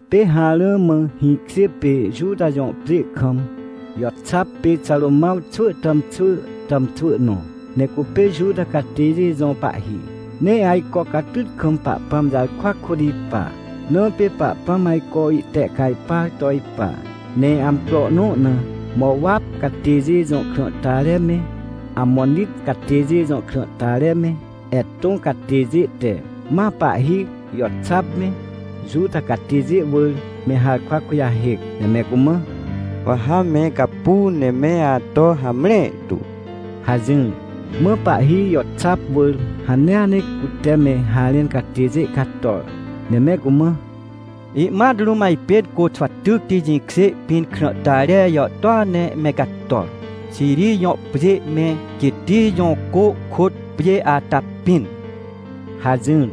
Pê harã mã hĩkjê pê Juta jõ pjê kam Joxap pê Xarômãw xwỳ tàmxwỳ tàmxwỳ nõ, ne cupê Juta catêjê jõ pahhi. Ne ajco catyt kam Pahpãm jarkwa kôt ipa, na pê Pahpãm ajco ihtehcajpar to ipa. Ne amcro nõ na Mowap catêjê jõ krãhtare me, Amonit catêjê jõ krãhtare me, Etõ catêjê te, ma pahhi Joxap me, Juta catêjê wỳr me harkwa kujahêc, ne me cumã: — Wa ha me gapu ne me ato hamre tu — hajỹr. Mã pahhi Joxap wỳr hanea ne cute me harẽn catêjê cator, ne me cumã: — Ihmat rũm ajpên Côxwatycti jĩkjê pĩn krãhtare jàhtôa ne me cator, Xiri jõ pjê me, Geti jõ cô kôt pjê ata pĩn — hajỹr.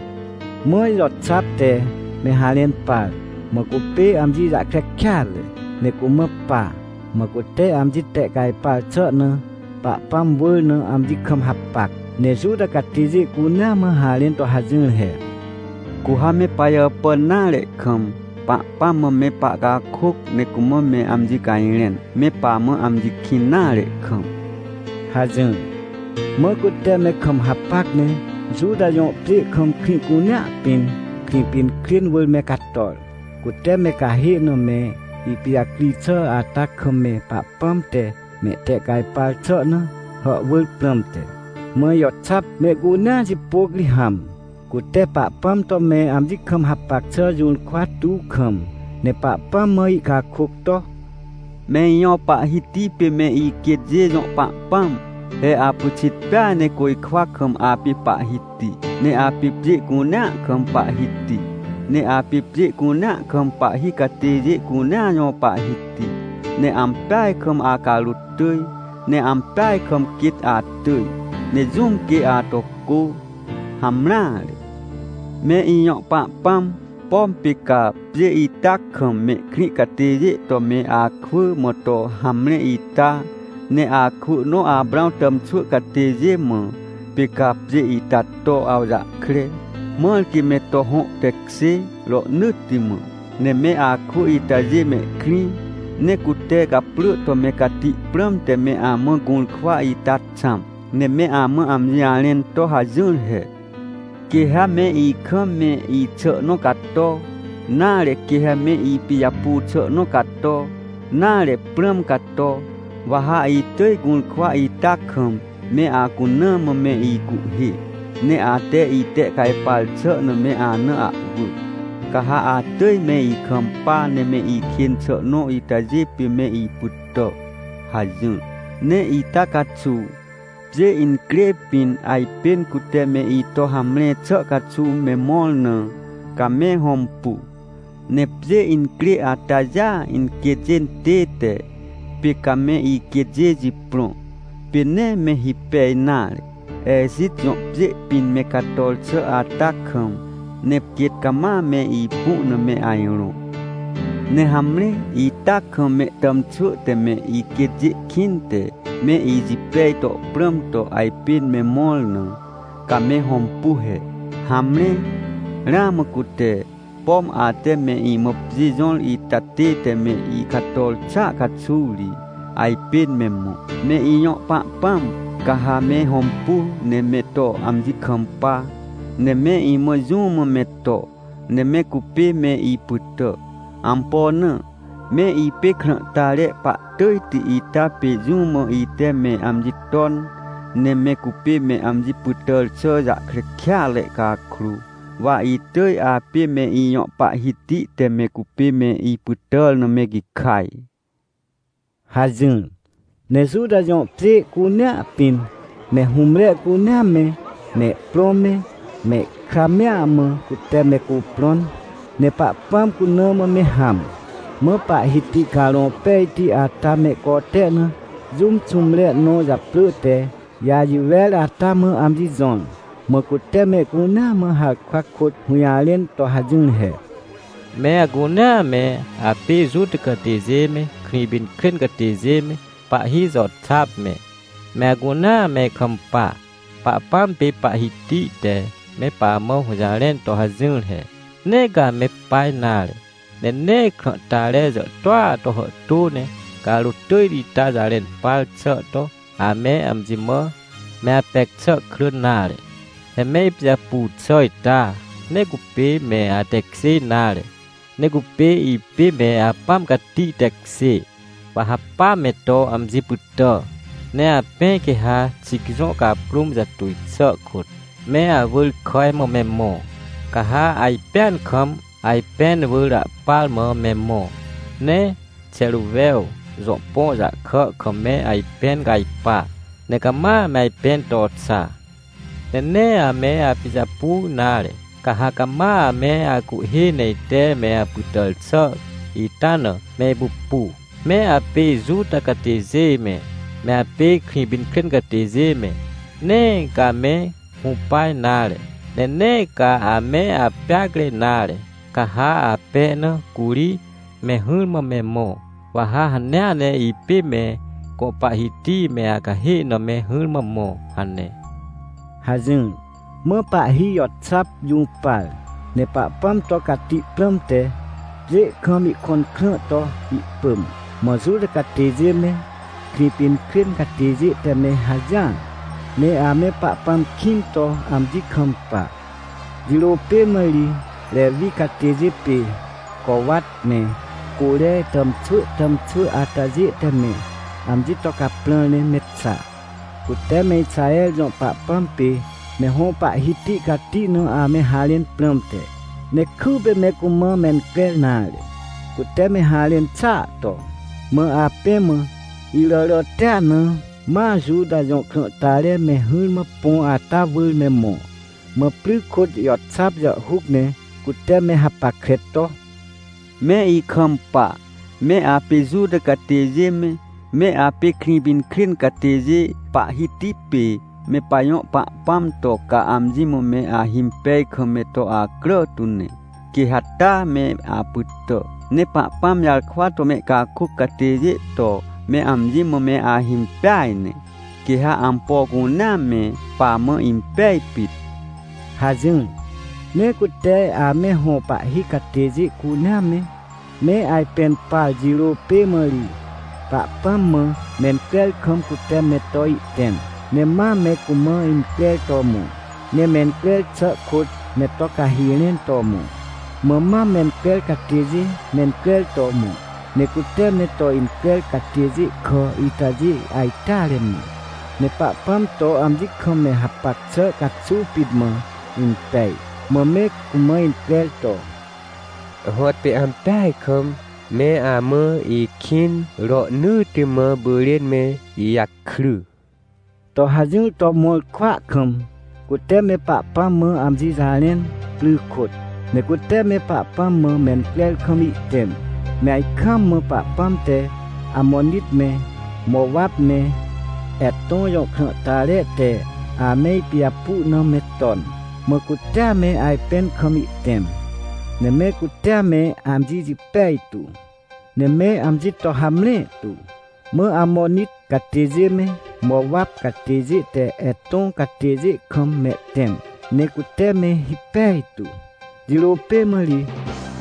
Mã Joxap te me harẽn par, mã cupê amji jahkre kêatre, ne cumã pa. Mã cute amji tehcajpar xà na Pahpãm wỳr na amji kam hapac, ne Juta catêjê cunea mã harẽn to hajỹr he: — Cu ha me pajàpàn nare kam, Pahpãm mã me pahcakôc ne cumã me amji cajrẽn, me pamã amji kĩn nare kam — hajỹr. Mã cute me kam hapac ne Juta jõ pjê kam krĩ cunea pĩn, Krĩpinkrên wỳr me cator, cute me cahê na me ipijacri xà ata kam me Pahpãm te mehtehcajpar xà na hàhwỳr prãmte. Mã Joxap mehcunea jipôc ri hãm, cute Pahpãm to me amji kam hapac xà jũrkwa tuw kam, ne Pahpãm mã ihcakôc to: — Me ijõ Pahhiti pê me iquêtjê jõ Pahpãm! He apyxit peaj ne côjkwa kam apê Pahhiti, ne apê pjê cunea kam Pahhiti. Ne apê pjê cunea kam pahhi catêjê cunea jõ Pahhiti. Ne ampeaj kam acarôt tỳj, ne ampeaj kam quêt atỳj. Ne jũm quê ato cô? Hamreare! Me ijõ Pahpãm, pom pê ca pjê ita kam mehkrĩ catêjê to me akwỳ mã to hamre ita? Ne akwỳ nõ Aprãw tàmxwỳ catêjê mã, pê ca pjê ita to awjahkre, mãr quê me to hõ tekjê rohnỳtti mã. Ne me akwỳ itajê mehkrĩ, ne cute gaprỳ to me cati prãmte me amã gũrkwa ita xãm, ne me amã amji jarẽn to hajỹr he: “Quê ha me ikam me ixà nõ cato, nare, quê ha me ipijapu xà nõ cato, nare, prãm cato, wa ha itỳj gũrkwa ita kam me acuna mã me icuhhê, ne ate itehcajpar xà na me ana ahwỳ, ca ha atỳj me ikampa ne me ikên xà nõ itajê pê me ipytà” hajỹr. Ne ita caxuw, pjê incrê pĩn ajpên cute me ito hamre xà caxuw me mõr na, ca me hõmpu. Ne pjê incrê atajêa inquêtjê tête, pê came iquêtjê jiprõ, pê nee me hipej nare, Ejit jõ pjê pĩn me cator xà ata kam, ne quêt cama me ipu na me ajrõ. Ne hamre, ita kam mehtàmxwỳ te me iquêtjê kĩnte, me ijipej to prãm to ajpên me mõr na, ca me hõmpu he! Hamre, ramã cute, pom ate me imã pjê jõr ita tête me icator xàa caxuw ri, ajpên me mõ. Me ijõ Pahpãm, ca ha me hõmpu ne me to amji kampa, ne me imã jũ mã me to, ne me cupê me ipytà. Ampo na? Me ipê krãhtare pahtỳjti ita pê jũ mã ite me amji ton, ne me cupê me amji pytàr xà jahkre kêatre cakrô, wa itỳj apê me ijõ Pahhiti te me cupê me ipytàr na me gikaj — hajỹr. Ne Juta jõ pjê cunea pĩn me hũmre cunea me, mehprõ me, mehkra mea mã cute me cuprõn, ne Pahpãm cuna mã me hãm. Mã Pahhiti Carõ Pejti ata mehcote na jũm xũmre nõ japrỳ te Jajiwer ata mã amji jõr, mã cute mehcunea mã harkwa kôt hũjarẽn to hajỹr he: — Me acunea me apê Juta catêjê me, Krĩpinkrên catêjê me, pahhi Joxap me, me acunea me ikampa! Pahpãm pê Pahhiti te me pamã hũjarẽn to hajỹr he: “Nee ca ame pa nare! Ne nee krãhtare jàhtôa to hàhtô ne carôt tỳjti ita jarẽn par xà to ame amji mã me apec xà crỳn nare! He me ipijapu xà ita, nee cupê me atekjê nare, ne cupê ipê me Apãm Cati tekjê, wa ha pa me to amji pytà. “Ne apẽ quê ha Xic jõ caprũm jatuj xà kôt, me awỳr kàj mã me mõ, ca ha ajpẽan kam, ajpẽn wỳr ahpar mã me mõ, ne Xeruwew jõ põ jahkà kam me ajpẽn cajpa, ne cama me ajpẽn to xa. Ne nee ame apijapu nare, ca ha cama ame acuhhê ne ite me apytàr xà ita na, me ipupu. Me apê Juta catêjê me, me apê Krĩpinkrên catêjê me, nee ca ame hũpa nare, ne nee ca ame apeacre nare! Ca ha apẽ na curi me hỹrmã me mõ, wa ha hanea ne ipê me gõ Pahhiti me acahê na me hỹrmã mõ” hane — hajỹr. Mã pahhi Joxap jũpar, ne Pahpãm to cati prãmte, pjê kam ihkõn krã to ihpỳm. Mã Juta catêjê me, Krĩpinkrên catêjê te me hajỹar, ne ame Pahpãm kĩn to amji kampa. Jirô pê mã ri Rewi catêjê pê Cowat me Côre tàmxwỳ tàmxwỳ atajê te me amji to caprãr ne me xa, cute me Ixaher jõ Pahpãm pê me hõ Pahhiti cati na ame harẽn prãmte, ne kypê me cumã mencrer nare, cute me harẽn xàa to. Mã apẽ mã iràràtia na, ma Juta jõ krãhtare me hỹrmã põ ata wỳr me mõ, mã pry kôt Joxap jàhhuc ne cute me hapackre to: — Me ikampa, me apê Juta catêjê me, me apê Krĩpinkrên catêjê, Pahhiti pê me pajõ Pahpãm to, ca amji mã me ahimpej kam me to acrà tu ne, quê ha taa me apytà! Ne Pahpãm jarkwa to mehcakôc catêjê to me amji mã me ahimpeaj ne, quê ha ampo cunea me pamã impej pit! — hajỹr. Ne cute ame hõ pahhi catêjê cunea me, me ajpẽn par jirô pê mã ri, Pahpãm mã mencrer kam cute me to ihtẽm, ne ma me cumã increr to mõ, ne mencrer xà kôt me to cahi rẽn to mõ. Mã mam mencrer catêjê mencrer to mõ. Ne cute me to increr catêjê kà itajê ajteare mã, ne Pahpãm to amji kam me hapac xà caxuw pit mã impej, mã me cumã increr to: “Hõtpê ampeaj kam, me amã ikĩn rohnỳtti mã pyrên me ijakry!” to hajỹr to mõr kwỳa kam, cute me Pahpãm mã amji jarẽn, pry kôt. Ne cute me Pahpãm mã mencrer kam ihtẽm, me ajkaam mã Pahpãm te Amonit me, Mowap me, Etõ jõ krãhtare te ame ipijapu na me ton. Mã cutea me ajpẽn kam ihtẽm, ne me cutea me amji jipej tu, ne me amji to hamre tu. Mã Amonit catêjê me, Mowap catêjê te Etõ catêjê kam mehtẽm ne cute me hipej tu. Jirô pê mã ri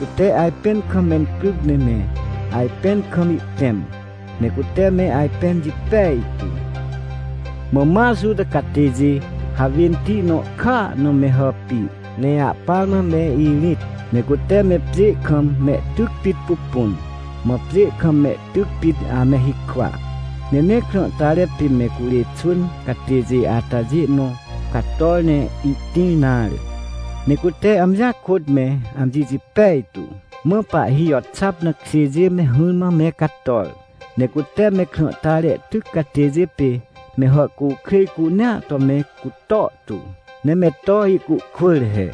cute ajpẽn kam mencryc ne me ajpẽn kam ihtẽm, ne cute me ajpẽn jipej tu! Mã ma Juta catêjê hawênti nõ kàa na me hàpir, ne ahpar mã me irĩt, ne cute me pjê kam mehtyc pit pupun, mã pjê kam mehtyc pit ame hikwa. Ne nee krãhtare pê me curê xwỳn catêjê atajê nõ cator ne ihtĩr nare, ne cute amjia kôt me amji jipej tu. Mã pahhi Joxap na kjêjê me hỹrmã me cator, ne cute me krãhtare tyc catêjê pê me hàhcukrêj cunea to me cutor tu, ne me to ihcuhkwỳr he.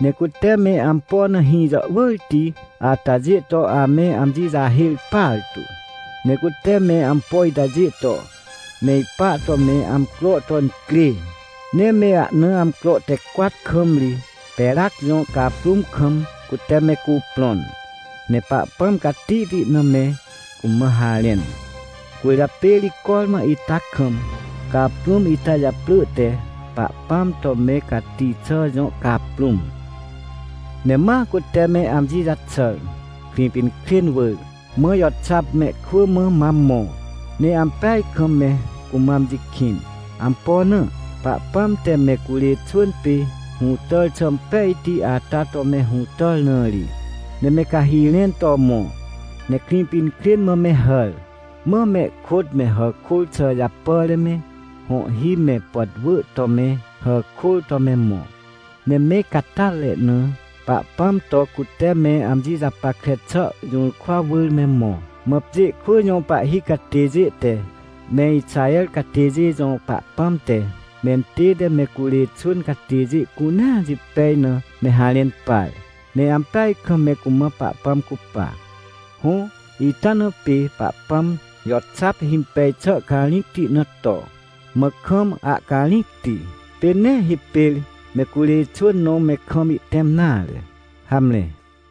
Ne cute me ampo na hĩ jàhwỳrti atajê to ame amji jahêr partu. Ne cute me ampo itajê to me ipa to me amcro to incrê! Ne me ahna amcro te cwat kam ri Perac jõ caprũm kam cute me cuprõn, ne Pahpãm catihti na me cumã harẽn. Cwỳrjapê ri cormã ita kam caprũm ita japrỳ te “Pahpãm to me cati xà jõ caprũm”. Ne ma cute me amji jaxàr, Krĩpinkrên wỳr, mã Joxap mehkwỳ mã mam mõ, ne ampeaj kam me cumã amji kĩn. Ampo na? Pahpãm te me curê xwỳn pê hũtàr xà impejti ata to me hũtàr na ri. Ne me cahi rẽn to mõ, ne Krĩpinkrên mã me hàr, mã mehkôt me hàkôr xà japàre me, hõhhi me pàtwỳ to me hàkôr to me mõ, ne me catyatre na Pahpãm to cute me amji japackre xà jũrkwa wỳr me mõ. Mã pjê kwỳ jõ pahhi catêjê te me Ixaher catêjê jõ Pahpãm te mentête me curê xwỳn catêjê cunea jipej na me harẽn par, ne ampeaj kam me cumã Pahpãm cupa. Hõ, ita na pê Pahpãm Joxap himpej xà carĩcti na to, mã kam ahcarĩcti. Pê nee hipêr me curê xwỳn nõ me kam ihtẽm nare. Hamre.